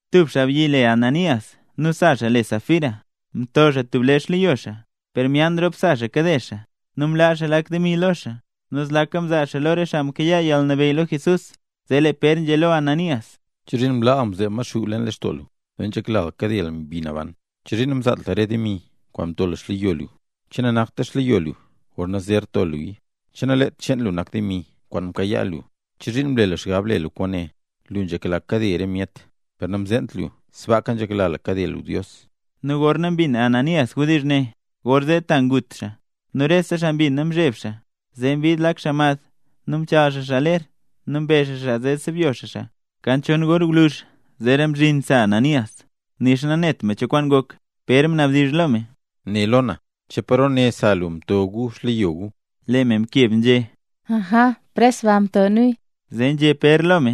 Tub xaabyi le Ananías nu sa xaa le Safira, mto xaa tub lee xleyo xaa. Per myaan rop sa xaa kade xaa, nu mlaa xaa lak demi lo xaa, nu zlaka mzaa xaa lo re xaa mkayaa yalnabeyy lo Jesús. Zee lee Pér nzhé lo Ananías: —¿Chozhiin mlaa lu mzeeb Maxuu leen lextoo lu, zee nzhekla lu kade lu Mbi Naban? ¿Chozhiin namzaat lu re demi kwaan mto lu xleyo lu? ¿Che nanakta xleyo lu gorna zer to luya? ¿Che nalet cheen lu nak demi kwaan mkayaa lu? ¿Chozhiin mle lu xgab le lu kwaane? Lu nzhekla kade re myet, per namzeent lu sbaaka nzhekla kade lu Dios. Nu gorna mbin Ananías wdizh ne, gorzee ta ngut xaa. Nu rese xaa mbina mzheb xaa. Zee mbid lak xaa mad, nu mchaal xaa ler, nu mbe xaa xaa zee sebyo xaa xaa. Kan chon gor gwluzh zeera mzhin sa Ananías, nixa nanet me cho kwaan ngok. Pér mnabdizh lo me: —Né lo na, ¿che paro ne sa lu mto gu xleyo gu? Lee me mkeb nzhé: —Aja, pres baa mto nuya. Zee nzhé Pér lo me: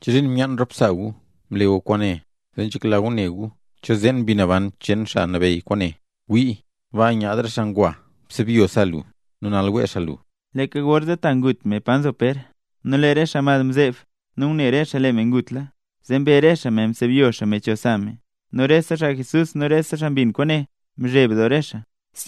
—¿Chozhiin myaan rop sa gu mle gu kwaane, zee nzhekla gu ne gu cho zeen Mbi Naban cheen Xaa Nabeyy kwaane? ¡Wii! Baa nyaad re xaa ngwa ngusebyo sa lu, nu nal wee xaa lu. Leeka gorzee ta ngut me pa nzo Pér. Nu lee re xaa mad mzeeb nu ngune re xaa lee me ngutla; zee mbe re xaa me, msebyo xaa me cho sa me. Nu rese xaa Jesús nu rese xaa mbin kwaane mzheb doo re xaa.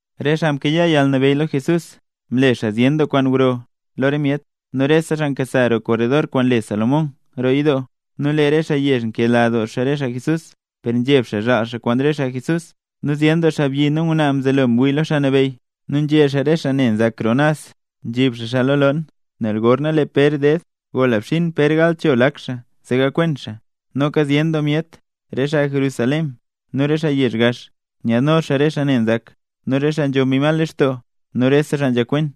Re xaa mkayaa yalnabeyy lo Jesús mle xaa zyen doo kwaan gro lo re myet. Nu rese xaa nkasa roo korredor kwaan le Salomón roo yidoo. Nu lee re xaa yezh nkedoola re xaa Jesús, per nzheb xaa zhaal xaa kwaan re xaa Jesús. Nu zyen doo xaabyi nu ngwnaa mzelo mwii lo Xaa Nabeyy. Nu nzhe xaa re xaa ne nzak roo naz, nzhib xaa xaa lo loon, nel gorna lee Pér ded gola xbzhin Pér gal cho lak xaa, zee gakwen xaa. Noka zyen doo myet, re xaa Jerusalén nu re xaa yezh gax, nyaadno xaa re xaa ne nzak nu re xaa nzho mbi mal lextoo. Nu rese xaa nzhakwen.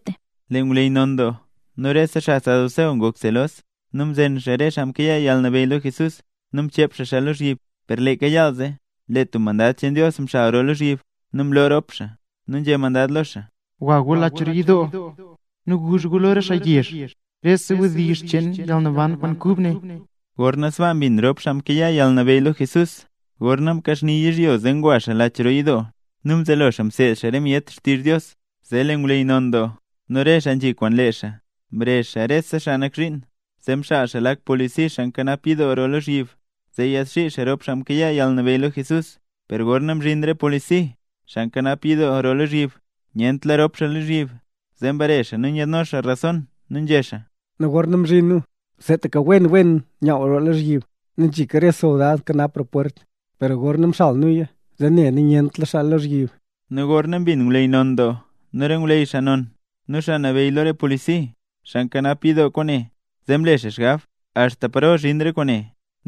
Lee ngwleyy non doo nu rese xaa saduceo ngok selos, nu mzen xaa rop xaa mkayaa yalnabeyy lo Jesús nu mchep xaa xaa lozhyib. Per leeka yaal zee, lee tub mandad cheen Dios mxal roo lozhyib nu mloo rop xaa, nu nzhé mandad lo xaa: —Gwa gu lo lach roo yidoo, nu guzh gu lo re xaa yezh rese wdizh cheen yalnaban kwaan kub ne. Gorna sbaa mbin rop xaa mkayaa yalnabeyy lo Jesús, gorna mkaxni yizhyo zee ngwa xaa lach roo yidoo, nu mzelo xaa mseed xaa re myet xtizh Dios. Zee lee ngwleyy non doo nu re xaa nzhi kwaan lee xaa, mrezh xaa rese xaa nak zhiin. Zee mxaal xaa lak polisi xaa nkanap yidoo roo lozhyib zee yaadxii xaa rop xaa mkayaa yalnabeyy lo Jesús. Per gorna mzhin re polisi, xaa nkanap yidoo roo lozhyib, nyentla rop xaa lozhyib. Zee mbare xaa nu nyaadno xaa rason, nu nzhé xaa: —Gorna mzhin nu seetaka wen wen nyaww roo lozhyib, nu nzhika re soldad nkanap roo pwert; per gorna mxal nuya zee ne nu nyentla xaa lozhyib. Nu gorna mbin ngwleyy non doo nu re ngwleyy xaa non nu xaa nabeyy lo re polisi xaa nkanap yidoo kwaane, zee mle xaa xgab: “¿Axta paro zhin re kwaane?”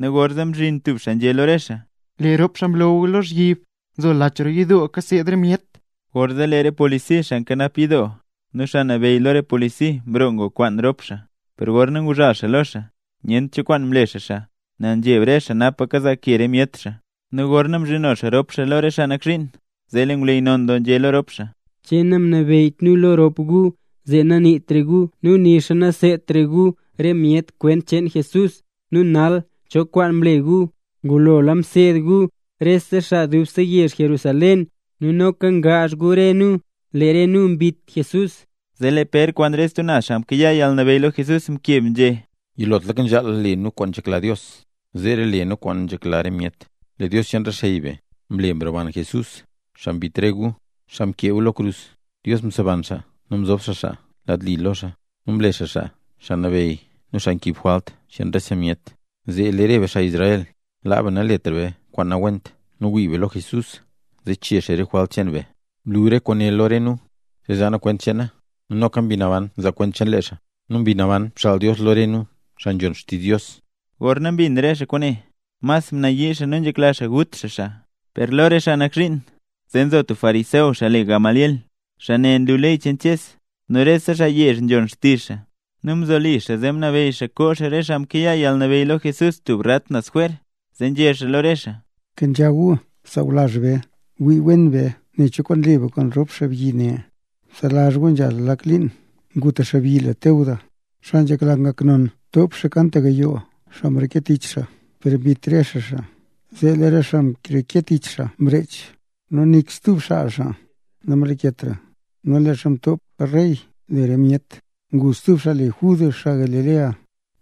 Nu gorzee mzhin tub xaa nzhé lo re xaa: —Lee rop xaa mlo gu lozhyib nzo lach roo yidoo kaseed re myet. Gorzee lee re polisi xaa nkanap yidoo nu xaa nabeyy lo re polisi mroo ngwakwaan rop xaa. Per gorna nguzhal xaa lo xaa, nyent cho kwaan mle re xaa xaa, nel nzheb re xaa napa kazaa ke re myet re xaa. Nu gorna mzhino xaa rop xaa lo re xaa nak zhiin, zee lee ngwleyy non doo nzhé lo rop xaa: —¿Che namnabeyyt nu lo rop gu zee naniitra gu nu nixa naseedtra gu re myet kwent cheen Jesús? ¿Nu nal, cho kwaan mle gu? Ngulola mseed gu rese xaa dubse yezh Jerusalén, nu noka ngaazh gu re nu, lee re nu mbit Jesús. Zee lee Pér kwaan stub xaa mkayaa yalnabeyy lo Jesús mkeb nzhé: —Yilotlaka nzhaal le nu kwaan nzhekla Dios; zeera le nu kwaan nzhekla re myet. Lee Dios cheen re xey be, mle mroban Jesús, xaa mbit re gu, xaa mkee gu lo krus. Dios mseban xaa nu mzob xaa xaa lad li lo xaa, nu mle xaa xaa, Xaa Nabeyy nu xaa nkiib jwalt cheen rese myet, zee lee re be xaa Israel, laa be naletra be kwaan nawent nu wii be lo Jesús, zee chee xaa re jwalt cheen be. Mlu re kwaane lo re nu zee zaa nu kwent cheena; nu noka Mbi Naban nzaa kwent cheen lee xaa, nu Mbi Naban mxaal Dios lo re nu, xaa nzhon xtizh Dios. Gorna mbin re xaa kwaane, mas nayii xaa nu nzhekla xaa ngut xaa xaa. Per lo re xaa nak zhiin, zee nzo tub fariseo, xaa le Gamaliel. Xaa ne nlu ley cheen Ches, nu rese xaa yezh nzhon xtizh xaa. Nu mzoli xaa zee mnabeyy xaa koo xaa rop xaa mkayaa yalnabeyy lo Jesús tub rat naz jwer. Zee nzhé xaa lo re xaa: —Kenzha gu, sawlazh be. Wii wen be nen cho kwaan le be kwaan rop xaabyi ne. Bselazh gu nzhala lak liin, ngu tub xaabyi le Teudas, xaa nzhekla ngak non; mtop xaa kan tap gayoo xaa mreke tich xaa. Per mbit re xaa xaa. Zee lee re xaa mreke tich xaa mrech, nu nik stub xaa xaa namlaketra. Nu leezha mtop rey le re myet, ngu stub xaa le Judas xaa Galilea,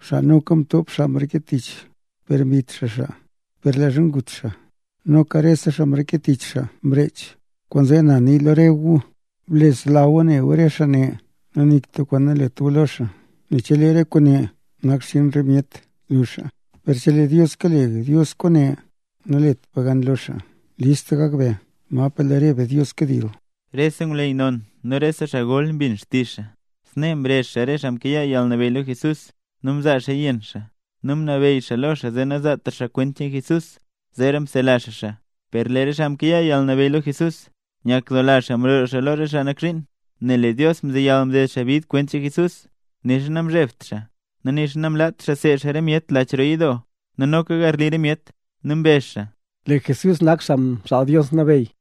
xaa noka mtop xaa mreke tich, per mbit xaa xaa. Per leezha gut xaa, noka rese xaa mreke tich xaa mrech. Kwaanzee na nii lo re gu, bsela gu re xaa ne, nu nik tub kwaan nalet gu lo xaa. Nel chelee re kwaane nak xchiin re myet, zluxa. Per chelee Dios kale Dios kwaane, nalet be gan lo xaa. List gak be, napa lee re be Dios kadil. Rese ngwleyy non nu rese xaa gol mbin xtizh xaa. Snee mrezh xaa re xaa mkayaa yalnabeyy lo Jesús, nu mzaa xaaya yenn xaa, nu mnabeyy xaa lo xaa zee nazaatra xaa kwent cheen Jesús; zeera msela xaa xaa. Per lee re xaa mkayaa yalnabeyy lo Jesús nyakdoola xaa mroo lo re xaa nak zhiin, nel lee Dios mzeyal mded xaa bid kwent cheen Jesús. Nixa namzhebt xaa nixa namlaat seed xaa re myet lach roo yidoo nu noka garli re myet. Nu mbezh xaa: —Lee Jesús nak Xaa Mxaal Dios Nabeyy.